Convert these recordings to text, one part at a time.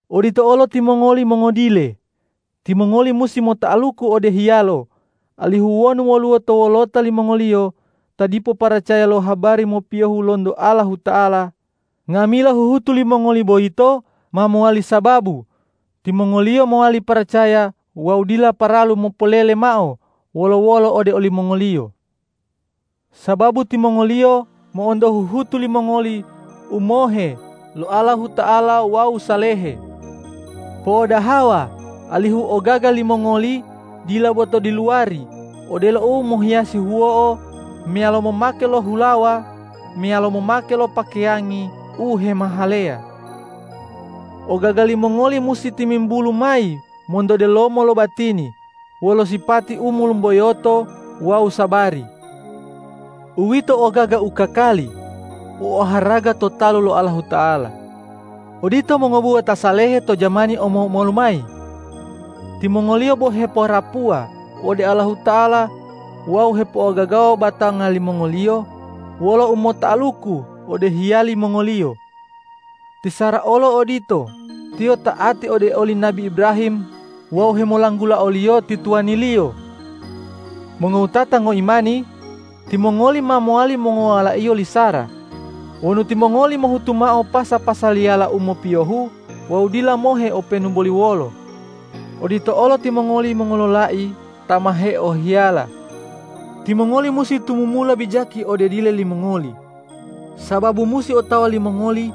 Odito olo timongoli mongodile: Timongoli musi mota'aluku ode hiyalo, alihu wonu woluwo to wolota limongoliyo ta dipo paracaya lo habari mopiyohe lonto Allahuta'ala, nga'amila huhutu limongoli boyito ma mowali sababu timongoliyo mowali paracaya wawu dila paralu mopolele mao wolo-wolo ode olimongoliyo. Sababu timongoliyo mo'onto huhutu limongoli u mohe lo Allahuta'ala wawu salehe. Po'odahawa alihu ogaga limongoli dila bo to diluwari odelo u mohiyasi huwo'o meyalo momake lo hulawa meyalo momake lo pakeyangi u hemahaleya. Ogaga limongoli musi timimbulu mayi monto delomiyo lo batini wolo sipati u molumboyoto wawu sabari. Uwito ogaga u kakali u oharaga to talu lo Allahuta'ala. Odito mongobuwa ta salehe to jamani omo-omolu mayi: Timongoliyo bo hepoharapuwa ode Allahuta'ala wawu hepo'ogagawa batanga limongoliyo wolo umota'aluku ode hiyali mongoliyo. Ti Sara olo odito; tiyo ta'ati ode oli nabi Ibrahim wawu hemolanggula oliyo ti tuwaniliyo. Mongowutata ngoimani, timongoli ma mowali mongowalaiyo li Sara wonu timongoli mohutu mao pasa-pasaliyala u mopiyohu wawu dila mohe openu boli wolo. Odito olo timongoli mongololai ta ma heohiyala: Timongoli musi tumumula bijaki ode dile limongoli, sababu musi otawa limongoli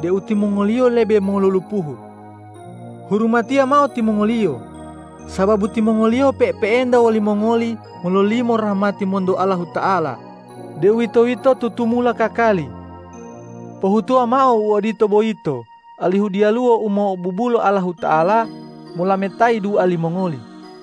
deu timongoliyo lebe molulupuhu. Hurumatiya mao timongoliyo, sababu timongoliyo pe'epe'enta wolimongoli mololimo rahmati monto Allahuta'ala, deuwitoyito tutumula kakali. Pohutuwa mao u odito boyito alihu diyaluwo u mo'obubula Allahuta'ala molametayi dua limongoli.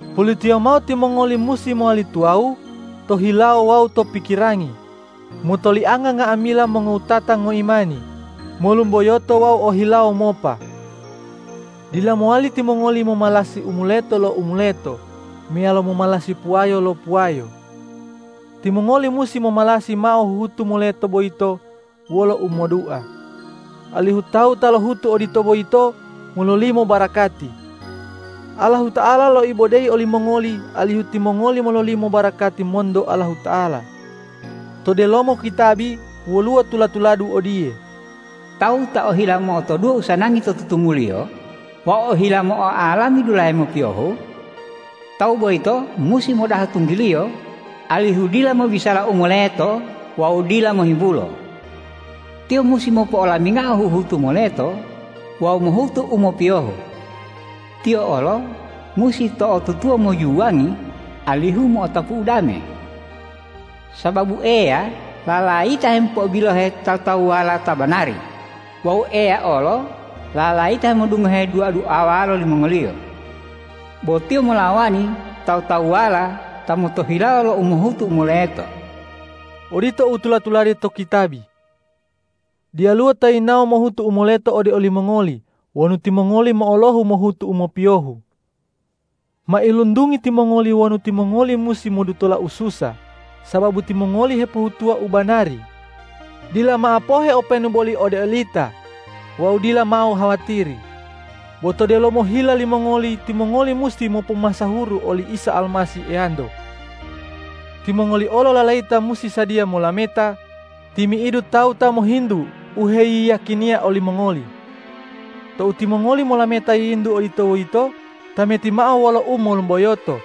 Pulitiyo mao timongoli musi mowali tuwawu to hilawo wawu to pikirangi, motolianga nga'amila mongowutata ngoimani, molumboyoto wawu o hilawo mopa. Dila mowali timongoli momalasi u moleto lo u moleto meyalo momalasi puwayo lo puwayo. Timongoli musi momalasi mao huhutu moleta boyito wolo u modua, alihu tawu ta lohutu odito boyito mololimo barakati. Allahuta'ala loibodeyi olimongoli alihu timongoli mololimo barakati monto Allahuta'ala. To delomo kitabi woluwo tula-tuladu odiye,”Tawu ta ohila mo'otoduwo usanangi to tutumuliyo wawu ohila mo'oalami dulahe mopiyohu. Tawu boyito musi modaha tunggiliyo, alihu dila mobisala u moletowawu dila mohimbulo. Tiyo musi mopo'olamingao huhutu moleto wawu mohutu u mopiyohu. Tiyo olo musi to'otutuwa mojuwangi, alihu mo'otapu udame. Sababu Eya lalayita hemopo'obilohe tawu-tawuwala ta banari wawu Eya olo lalayita hemodungohe dua-duawala limongoliyo. Bo Tiyo molawani tawu-tawuwala ta motohilawo lo umohutu u moleto.” Odito u tula-tulade to kitabi. Diyaluwo ta yinawo mohutu u moleto ode olimongoli wonu timongoli mo'olohu mohutu u mopiyohu. Mailuntungi timongoli wonu timongoli musi modutola ususa sababu timongoli hepohutuwa u banari. Dila mao pohe openu boli ode olita wawu dila mao hawatiri. Bo to delomo hila limongoli timongoli musi mopomasahuru oli Isa Almasih Eyanto. Timongoli olo lalayita musi sadiya molameta timi'idu tawu ta mohintu u heyiyakiniya olimongoli. Tou timongoli molameta yiyintu odito boyito, tameti mao wolo umolumboyoto,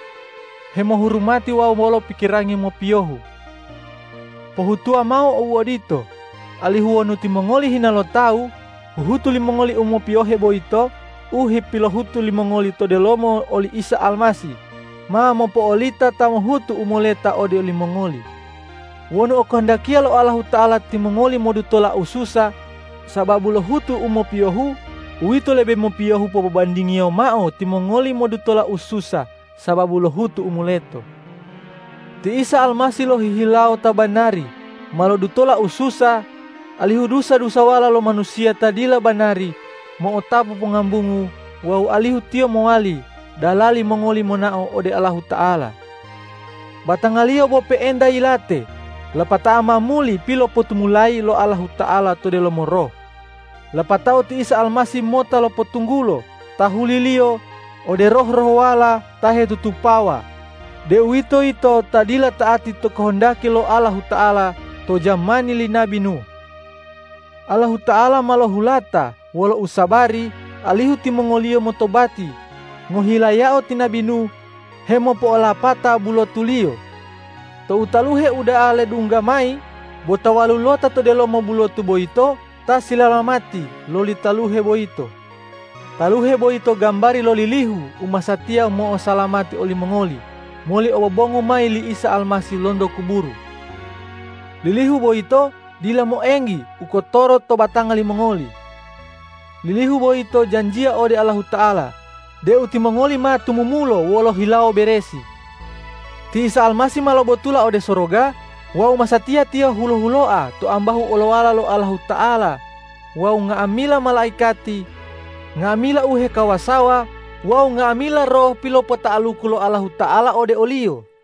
hemohurumati wawu wolo pikirangi mopiyohu. Pohutuwa mao uodito, alihu wonu timongoli hina lo tawu, huhutu limongoli u mopiyohe boyito u hepilohutu limongoli to delomo oli Isa Almasih, ma mopo'olita ta mohutu u moleta ode olimongoli. Wonu okohondakiya lo Allahuta'ala timongoli modutola ususa sababu lohutu u mopiyohu, uwito lebe mopiyohu popobandingiyo mao timongoli modutola ususa sababu lohutu u moleto. Ti Isa Almasih lohihilawo ta banari ma lodutola ususa, alihu dusa-dusawala lo manusiya ta dila banari mo'otapu pongambungu wawu alihu Tiyo mowali dalali mongoli monao ode Allahuta'ala. Batanga-Liyo bo pe'enta yilate, lapatao ma muli pilopotumulayi lo Allahuta'ala to delomo Roh. Lapatao ti Isa Almasih mota lopotunggulo tahuli-Liyo ode roh-rohwala ta hetutupawa, deuwitoyito ta dila ta'ati to kohondaki lo Allahuta'ala to jamani li nabi Nuh. Allahuta'ala ma lohulata wolo usabari, alihu timongoliyo motobati ngohilayao ti nabi Nuh hemopo'olapata bulotuliyo. Tou taluhe uda'a ledungga mayi, bo ta walulota to delomo bulotu boyito ta silalamati loli taluhe boyito. Taluhe boyito gambari lo lilihu u masatiya mo'osalamati olimongoli moli obobongu mayi li Isa Almasih lonto kuburu. Lilihu boyito dila moenggi u kotoro to batanga limongoli. Lilihu boyito janjiya ode Allahuta'ala deu timongoli ma tumumulo wolo hilawo beresi. Ti Isa Almasih ma lobotula ode soroga wawu masatiya Tiyo hulo-huloa to ambahu olowala lo Allahuta'ala wawu nga'amila malaikati, nga'amila u hekawasawa wawu nga'amila roh pilopota'aluku lo Allahuta'ala ode o-Liyo.